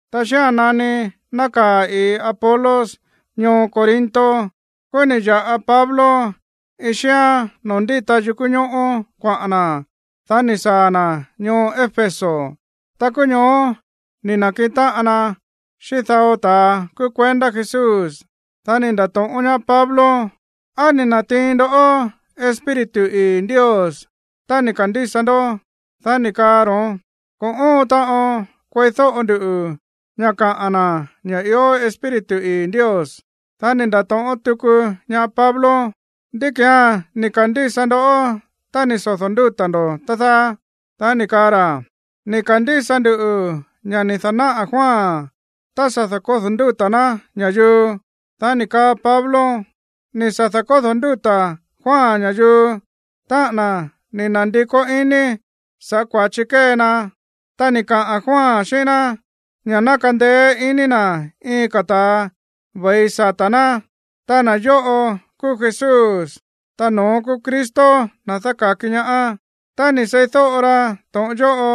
Ta xía̱n nani nákaa̱ ii̱ Apolos ñoo Corinto, kúú ni̱ ya̱ꞌa Pablo iin xíán noo̱ ndíta yukú ñóꞌó kuaꞌa̱n na̱. Dá ni̱ saa̱ na̱ ñoo Éfeso. Ta kúú ñoó ni̱ na̱kiꞌin táꞌan na xíꞌín dao ta̱a kúú kuendá Jesús. Dá ni̱ nda̱to̱ꞌón ñaá Pablo: ―¿Á ni̱ na̱tiin ndoꞌó Espíritu ii̱ Ndios tá ni̱ ka̱ndísa ndó? Dá ni̱ kaa ro̱ón: ―Ko̱ óon taꞌon kueídóꞌo ndu ña̱ kaꞌa̱n na̱ ña̱ ió Espíritu ii̱ Ndios. Dá ni̱ nda̱to̱ꞌón tuku ñaá Pablo: ―¿Ndí ki̱án ni̱ ka̱ndísa ndó tá ni̱ sodo̱ ndúta̱ ndo̱, tá dáá? Dá ni̱ kaa ra̱: ―Ni̱ ka̱ndísa nduꞌu̱ ña̱ ni̱ da̱náꞌa̱ Juan tá sa̱ da̱kódo̱ ndúta̱ ná ña̱yuu. Dá ni̱ kaa Pablo: ―Ni̱ sa̱ da̱kódo̱ ndúta̱ Juan ña̱yuu, táꞌa̱n na̱ ni̱ na̱ndikó iní sa̱ꞌá kua̱chi kée na. Ta ni̱ kaꞌa̱n Juan xíꞌín ná ña̱ ná kandeé iní na̱ iin ka̱ ta̱a ve̱i sata̱ ná. Ta na̱ yóꞌo kúú Jesús, ta no̱ón kúú Cristo, na̱ dáka̱ki ñaá. Tá ni̱ seídóꞌo ra to̱ꞌon yóꞌo,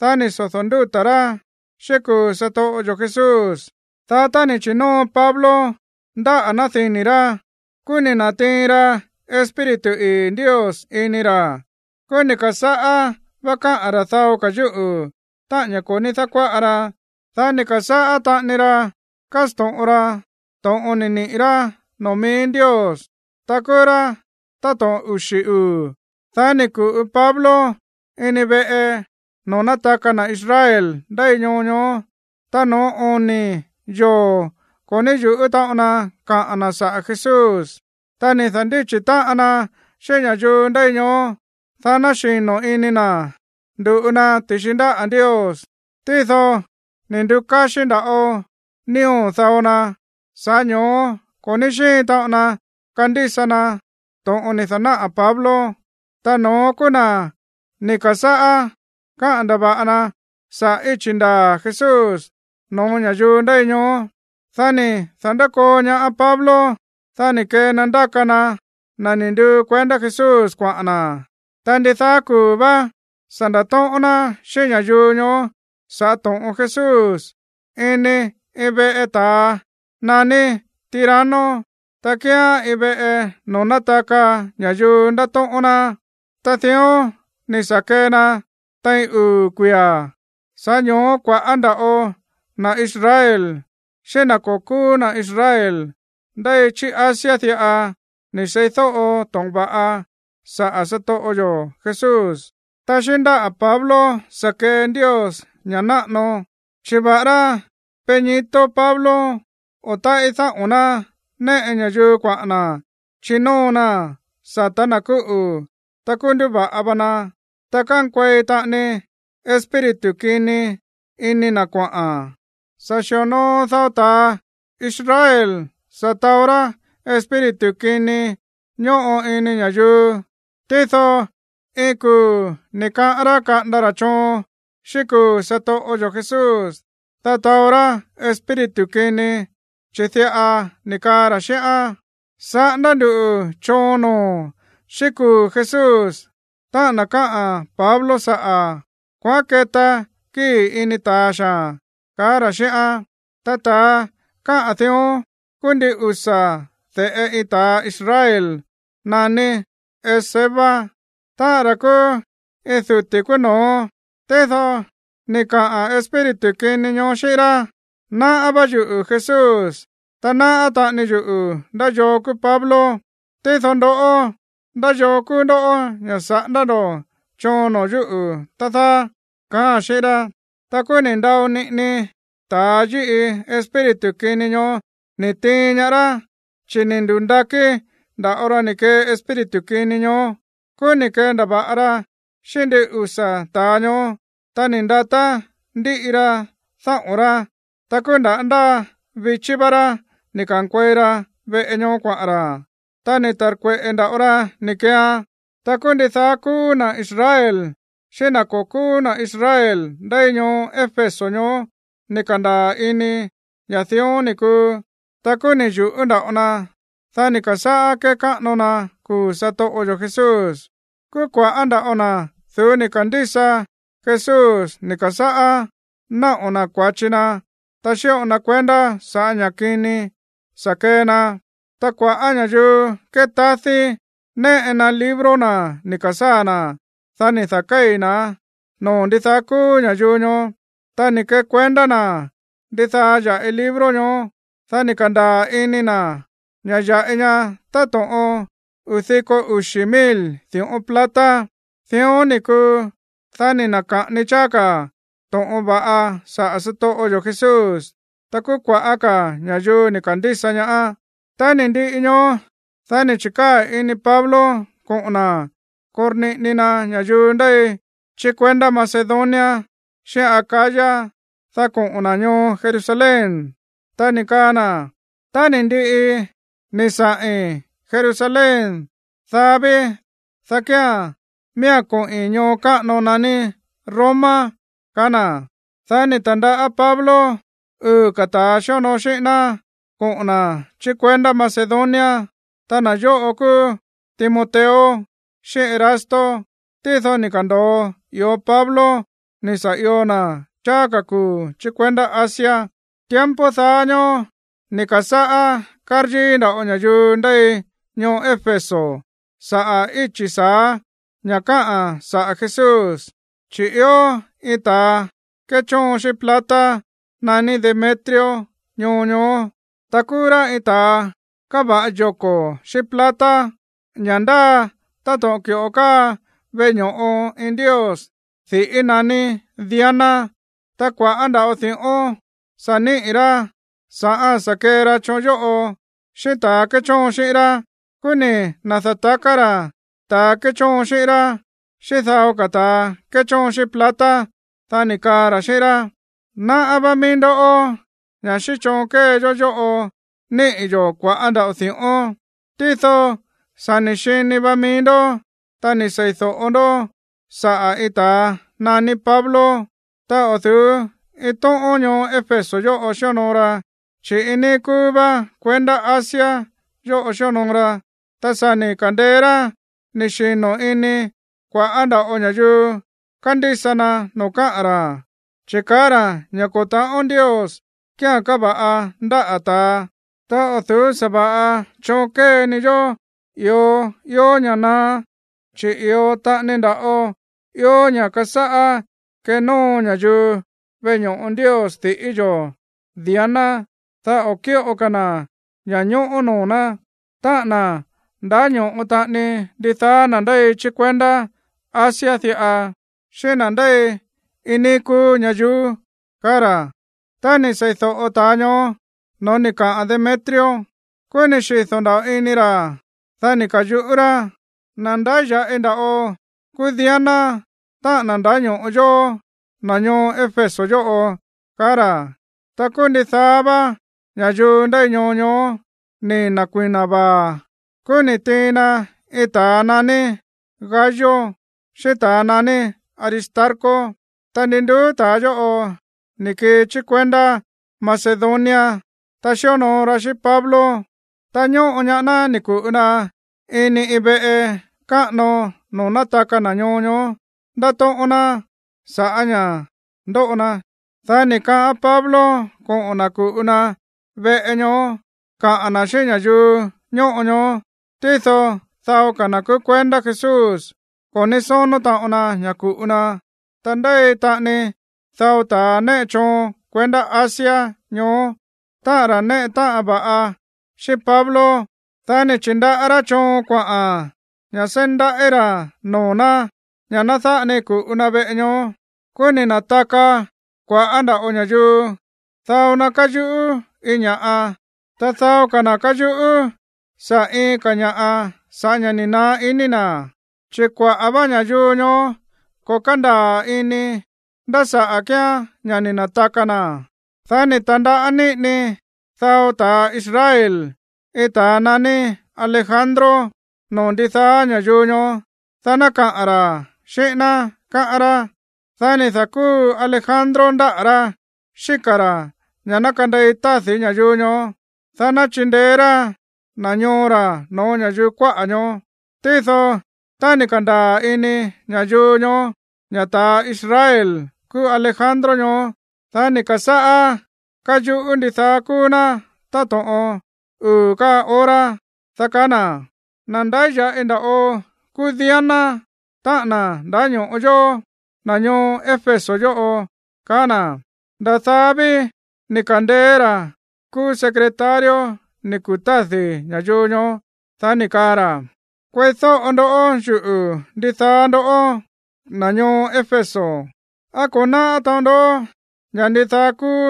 dá ni̱ sodo̱ ndúta̱ rá xíꞌín kuu̱ satoꞌo yo̱ Jesús. Dá tá ni̱ chi̱nóo Pablo ndáꞌa̱ ná dini̱ rá, kúú ni̱ na̱tiin ra Espíritu ii̱ Ndios ini ra̱. Kúú ni̱ ka̱sáꞌá vá káꞌa̱n ra̱ dao ka̱ yúꞌu̱, táꞌa̱n ña̱ ko̱ ní dákuáꞌa ra. Dá ni̱ ka̱sáꞌá taꞌani ra kásto̱ꞌon ra to̱ꞌon ni̱ niꞌi̱ rá noo̱ mií Ndios. Ta kúú rá táto̱ꞌon uxi̱ uu̱. Dá ni̱ ku̱ꞌu Pablo ini veꞌe noo̱ nátaka na̱ Israel ndéi ñoo ñoó. Ta no̱ó oni̱ yoo̱ ko̱ ní yu̱ꞌú taꞌon na kaꞌa̱n na̱ saꞌa̱ Jesús. Ta ni̱ da̱ndíchi̱ táꞌan na xíꞌín ña̱yuu ndéi ñoó, dá ná xino̱ ini na̱ ndu̱ꞌu na ti̱xi ndáꞌa̱ Ndios. Tído ni̱ ndu̱káxí nda̱ꞌo nío̱ dao na, sa̱ꞌá ño̱ó ko̱ ní xíin taꞌon na kandísa na to̱ꞌon ni̱ da̱náꞌa̱ Pablo. Ta no̱ón kúú na̱ ni̱ ka̱sáꞌá káꞌa̱n ndava̱ꞌa na saꞌa̱ íchi̱ ndaa̱ Jesús no̱ó ña̱yuu ndéi ñoó. Dá ni̱ da̱nkoo ñaá Pablo. Dá ni̱ kee na ndáka na na̱ ni̱ nduu kuendá Jesús kuaꞌa̱n na̱. Ta ndidaá kuu̱ vá sa̱ nda̱tóꞌón ná xíꞌín ña̱yuu ñoó sa̱ꞌá to̱ꞌon Jesús ini iin veꞌe ta̱a naní Tirano, ta kíán iin veꞌe noo̱ nátaka ña̱yuu ndátóꞌón ná. Ta dión ni̱ sa̱ kee na tein uu̱ kuia̱. Sa̱ꞌá ño̱ó kua̱ꞌá nda̱ꞌo na̱ Israel xíꞌín na̱ ko̱ kúú na̱ Israel ndéi chí Asia diꞌa ni̱ seídóꞌo to̱ꞌon va̱ꞌa saꞌa̱ satoꞌo yo̱ Jesús. Ta xíꞌín ndáꞌa̱ Pablo sa̱ kee Ndios ña̱ꞌa náꞌano, chi̱ va̱ꞌará peñito Pablo o táꞌí dáꞌo̱n ná néꞌe ña̱yuu kuaꞌa̱n na̱ chinóo naa̱n sata̱ na̱ kúꞌu̱, ta kúú nduva̱ꞌa va na. Ta kánkuei taꞌani espíritu kini ini na̱ kuaꞌa̱n. Sa̱ xi̱onoo dao ta̱ Israel sa̱ taó rá espíritu kini ñóꞌo ini ña̱yuu. Tído iin kuu̱ ni̱ kaꞌán rá kaꞌanda ra̱ choon xíꞌín kuu̱ satoꞌo yo̱ Jesús, dá taó rá espíritu kini, chi̱ diꞌa ni̱ kaa ra̱ xíꞌán: ―Saꞌándá nduꞌu̱ choon noo̱o̱n xíꞌín kuu̱ Jesús, táꞌa̱n na̱ káꞌa̱n Pablo saꞌa̱. Kuaꞌán keta kíi̱ ini ta̱a xaa̱n ―kaá ra̱ xíꞌán. Ta ta̱a káꞌa̱n dión kúú ndin usa̱ de̱ꞌe iin ta̱ Israel naní Esceva, táꞌa̱n ra̱ kúú iin duti̱ kúú no̱ó. Tído ni̱ kaꞌa̱n espíritu kini ñoó xíꞌín rá: ―Náꞌá vá yuꞌu̱ Jesús. Ta náꞌá taꞌani yuꞌu̱ ndá yoo kúú Pablo. Tído ndoꞌó, ¿ndá yoo kúú ndoꞌó ña̱ saꞌándá ndo̱ choon noo̱ yúꞌu̱, tá dáá? ―kaáa̱n xíꞌín rá. Ta kúú ni̱ ndao niꞌini ta̱a yíꞌi espíritu kini ñoó ni̱ tiin ñaá rá, chi̱ ni̱ ndu̱ndakí nda̱ꞌo ra ni̱ kee espíritu kini ñoó. Kúú ni̱ kendava̱ꞌa ra xíꞌín ndin usa̱ ta̱a ñoó, ta ni̱ ndatá ndíꞌi ra dáꞌo̱n rá. Ta kúú nda̱ ndáa vichí vá rá ni̱ ka̱nkuei ra veꞌe ñoó kuaꞌa̱n ra̱, ta ni̱ ta̱rkueꞌe̱ nda̱ꞌo ra ni̱ keean. Ta kúú ndidaá kúú na̱ Israel xíꞌín na̱ ko̱ kúú na̱ Israel ndéi ñoo Éfeso ñoó ni̱ ka̱ndaa̱ ini ña̱ dión ni̱ kuu. Ta kúú ni̱ yu̱ꞌú nda̱ꞌo na. Dá ni̱ ka̱sáꞌá kékáꞌano na kuu̱ satoꞌo yo̱ Jesús. Kúú kua̱ꞌá nda̱ꞌo na̱ du̱ú ni̱ ka̱ndísa Jesús ni̱ ka̱sáꞌá náꞌo̱ na̱ kua̱chi na̱, ta xíꞌo na kuendá sa̱ꞌá ña̱ kini sa̱ kee na. Ta kua̱ꞌá ña̱yuu kétádí néꞌe na libro na̱ ni̱ ka̱sáa̱ na̱. Dá ni̱ da̱kéi̱ na̱án noo̱ ndidaá kúú ña̱yuu ñoó. Ta ni̱ kekuendá na̱ ndidaá ya̱ꞌi libro ñoó. Dá ni̱ ka̱ndaa̱ ini na̱ ña̱ ya̱ꞌi ña táto̱ꞌon uu̱ diko uxi̱ mil di̱ꞌón plata. Dión ni̱ kuu, dá ni̱ na̱ka̱ꞌani cháá ka̱ to̱ꞌon va̱ꞌa saꞌa̱ satoꞌo yo̱ Jesús, ta kúú kua̱ꞌá ka̱ ña̱yuu ni̱ ka̱ndísa ñaá. Tá ni̱ ndiꞌi ñoó, dá ni̱ chi̱kaa̱ ini Pablo koꞌo̱n na̱ korniꞌini na ña̱yuu ndéi chí kuendá Macedonia xíꞌín Acaya, dá koꞌo̱n na̱ ñoo Jerusalén. Ta ni̱ kaa na̱: ―Tá ni̱ ndiꞌi ni̱ saꞌi̱n Jerusalén, dá ví, dá kía̱n miía̱n koꞌi̱n ñoo káꞌano naní Roma ―kaá na̱. Dá ni̱ ta̱ndaꞌá Pablo uu̱ ka̱ ta̱ xíonoo xíꞌín ná koꞌo̱n na̱ chí kuendá Macedonia. Ta na̱ yóꞌo kúú Timoteo xíꞌín Erasto. Tído ni̱ ka̱ndo̱o i̱ó Pablo ni̱ sa̱ io na̱ cháá ka̱ kuu̱ chí kuendá Asia. Tiempo daá ñóó ni̱ ka̱sáꞌá káryíí nda̱ꞌo ña̱yuu ndéi ñoo Éfeso saꞌa̱ íchi̱ sa̱á ña̱ káꞌa̱n saꞌa̱ Jesús. Chi̱ ió iin ta̱a kéchóon xíꞌín plata naní Demetrio ñoo ñoó. Ta kúú rá iin ta̱a káva̱ꞌa yoko̱ xíꞌín plata, ña̱ ndáa táto̱ꞌon ki̱ꞌo káa veꞌe ño̱ꞌo iin ndios diꞌí naní Diana. Ta kua̱ꞌá nda̱ꞌo di̱ꞌón sa̱ níꞌi̱ rá sa̱ꞌá sa̱ kee ra choon yóꞌo, xíꞌín ta̱a kéchóon xíꞌín rá. Kúú ni̱ na̱da̱taká ra̱ ta̱a kéchóon xíꞌín rá, xíꞌín dao ka̱ ta̱a kéchóon xíꞌín plata. Dá ni̱ kaa ra̱ xíꞌín rá: ―Náꞌá vá mií ndó ña̱ xíꞌín choon kée yó yóꞌo níꞌi̱ yo̱ kua̱ꞌá nda̱ꞌo di̱ꞌón. Tído sa̱ ni̱ xini va mií ndó, ta ni̱ sei̱do̱ꞌo ndó saꞌa̱ iin ta̱a naní Pablo. Ta o̱ du̱ú iin tóꞌón ñoo Éfeso yóꞌo xíonoo ra, chi̱ iin níí kúú vá kuendá Asia yóꞌo xíonoo ra. Ta sa̱ ni̱ ka̱ndeé rá ni̱ xino̱ ini kua̱ꞌá nda̱ꞌo ña̱yuu kandísa na noo̱ káꞌa̱n ra̱, chi̱ kaá ra̱ ña̱ ko̱ ta̱ꞌón ndios kíán káva̱ꞌa ndáꞌa̱ ta̱a. Ta o̱ du̱ú sa̱va̱ꞌa choon kée ni yó i̱o ió ña̱ naá, chi̱ i̱o taꞌani nda̱ꞌo ió ña̱ kasáꞌá kenóo ña̱yuu veꞌe ño̱ꞌo ndios diꞌí yo̱ Diana, dá o̱ kíꞌo ka̱ na̱ ña̱ñóꞌó noo̱ ná, táꞌa̱n na̱ ndáño̱ꞌo taꞌani ndidaá na̱ ndéi chí kuendá Asia diꞌa, xíꞌín na̱ ndéi iin níí kúú ñayuú ―kaá ra̱. Tá ni̱ seídóꞌo ta̱a ñoó no̱ó ni̱ kaꞌa̱n Demetrio, kúú ni̱ xido̱ nda̱ꞌo ini ra̱. Dá ni̱ ka̱yuꞌú rá: ―Na̱ ndáya̱ꞌi nda̱ꞌo kúú Diana, táꞌa̱n na̱ ndáño̱ꞌo yóó, na̱ ñoo Éfeso yóꞌo ―kaá ra̱. Ta kúú ndidaá vá ña̱yuu ndéi ñoo ñoó ni̱ na̱kui̱na vaa̱. Kúú ni̱ tiin na iin ta̱a naní Gayo xíꞌín ta̱ naní Aristarco. Ta ndi nduú ta̱a yóꞌo ni̱ kii chí kuendá Macedonia, ta xíonoo ra xíꞌín Pablo. Ta ñóꞌo ñaá ná ni̱ ku̱ꞌu na ini iin veꞌe káꞌano noo̱ nátaka na̱ ñoo ñoó ndátóꞌón ná saꞌa̱ ña̱ꞌa ndóꞌo na. Dá ni̱ kaꞌán Pablo koꞌo̱n na̱ ku̱ꞌu na veꞌe ñoó kaꞌa̱n na̱ xíꞌín ña̱yuu ñóꞌo ñoó. Tído dao ka̱ na̱ kúú kuendá Jesús ko̱ ní sónó taꞌon na ña̱ ku̱ꞌu na. Ta ndéi taꞌani dao ta̱ néꞌe choon kuendá Asia ñoó, táꞌa̱n ra̱ néꞌe táꞌan va̱ꞌa xíꞌín Pablo. Dá ni̱ chi̱ndaꞌá rá choon kuaꞌa̱n ña̱ seí ndaꞌí ra̱ noo̱ ná ña̱ ná dáꞌa ni ku̱ꞌu na veꞌe ñoó. Kúú ni̱ na̱taka kua̱ꞌá nda̱ꞌo ña̱yuu. Dao na káyuꞌú iin ña̱ꞌa, ta dao ka̱ na̱ káyuꞌú saꞌa̱ iin ka̱ ña̱ꞌa sa̱ꞌá ña̱ ni̱ naá iní na̱. Chi̱ kuaꞌa̱ vá ña̱yuu ñoó ko̱ kándaa̱ ini nda̱ saꞌa̱ kíán ña̱ ni̱ na̱taka na̱. Dá ni̱ ta̱ndaꞌá niꞌini dao ta̱a Israel iin ta̱a naní Alejandro noo̱ ndidaá ña̱yuu ñoó, dá ná kaꞌa̱n ra̱ xíꞌín ná, káꞌán rá. Dá ni̱ da̱kúu Alejandro ndáꞌa̱ rá xíka̱ ra̱ ña̱ ná kandei tádi̱ ña̱yuu ñoó, dá ná chindeé rá na̱ ñoo ra̱ no̱ó ña̱yuu kuáꞌa̱ ñoó. Tído tá ni̱ ka̱ndaa̱ ini ña̱yuu ñoó ña̱ ta̱ Israel kúú Alejandro ñoó, dá ni̱ ka̱sáꞌá káyuꞌú ndidaá kúú ná táto̱ꞌon uu̱ ka̱ hora, dá kaá na̱: ―¡Na̱ ndáya̱ꞌi nda̱ꞌo kúú Diana, táꞌa̱n na̱ ndáño̱ꞌo yóó, na̱ ñoo Éfeso yóꞌo! ―kaá na̱. Nda̱ daá ví ni̱ ka̱ndeé ra̱ kúú secretario ni̱ kutádi̱ ña̱yuu ñoó. Dá ni̱ kaa ra̱: ―Kueídóꞌo ndó yuꞌu̱, ndidaá ndoꞌó, na̱ ñoo Éfeso. ¿Á ko̱ náꞌá taꞌon ndó ña̱ ndidaá kúú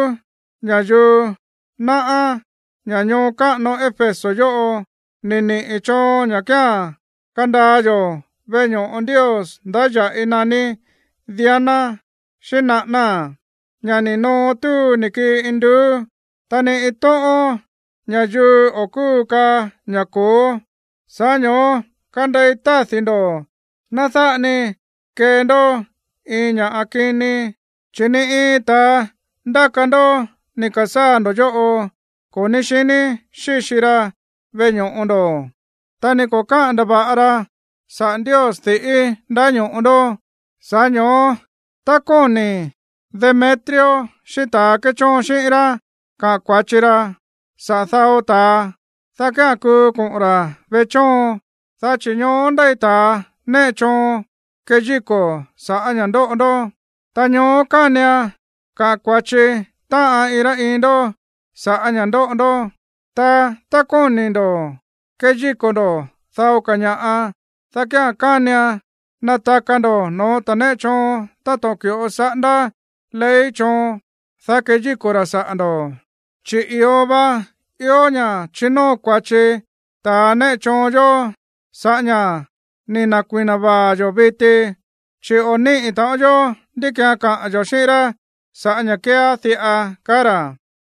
ña̱yuu náꞌá ña̱ ñoo káꞌano Éfeso yóꞌo ni̱ niꞌi̱ choon ña̱ kía̱n kandaa yo̱ veꞌe ño̱ꞌo ndios ndáya̱ꞌi naní Diana xíꞌín naꞌánáa̱n, ña̱ ni̱ noo túu ni̱ kii induú? Ta ni iin tóꞌón ña̱yuu o̱ kúu kaá ña̱ ko̱ó. Sa̱ꞌá ño̱ó kandei tádi̱ ndo̱. Ná dáꞌa ni kee ndó iin ña̱ꞌa kini. Chi̱ ni iin ta̱a ndáka ndó ni̱ ka̱sáa̱ ndo̱ yóꞌo ko̱ ní xiní xíxi ra veꞌe ño̱ꞌo ndo̱, ta ni ko̱ káꞌa̱n ndava̱ꞌa ra saꞌa̱ ndios diꞌí ndáño̱ꞌo ndó. Sa̱ꞌá ño̱ó tá kóni̱ Demetrio xíꞌín ta̱a kéchóon xíꞌín rá kaꞌa̱n kua̱chi ra saꞌa̱ dao ta̱a, dá kía̱n kuu koꞌo̱n ra̱ veꞌe chóon, dá chi̱ ñoó ndéi ta̱a néꞌe choon keyíko̱ saꞌa̱ ña̱ ndóꞌo ndó. Ta ñoó kánian kaꞌa̱n kua̱chi táꞌan iin rá iin ndó sa̱ꞌá ña̱ ndóꞌo ndó. Ta tá kóni̱ ndo̱ keyíko̱ ndo̱ dao ka̱ ña̱ꞌa, dá kía̱n kánian nataka ndo̱ no̱ó ta̱ néꞌe choon táto̱ꞌon ki̱ꞌo saꞌándá ley choon, dá keyíko̱ ra̱ saꞌa̱ ndo̱. Chi̱ i̱o va ió ña̱ chinóo kua̱chi ta̱ néꞌe choon yó sa̱ꞌá ña̱ ni̱ na̱kui̱na vaa̱ yo̱ viti. Chi̱ o̱ níꞌi̱ taꞌon yó ndí ki̱án kaꞌa̱n yo̱ xíꞌín rá sa̱ꞌá ña̱ kéeá diꞌa ―kaá ra̱.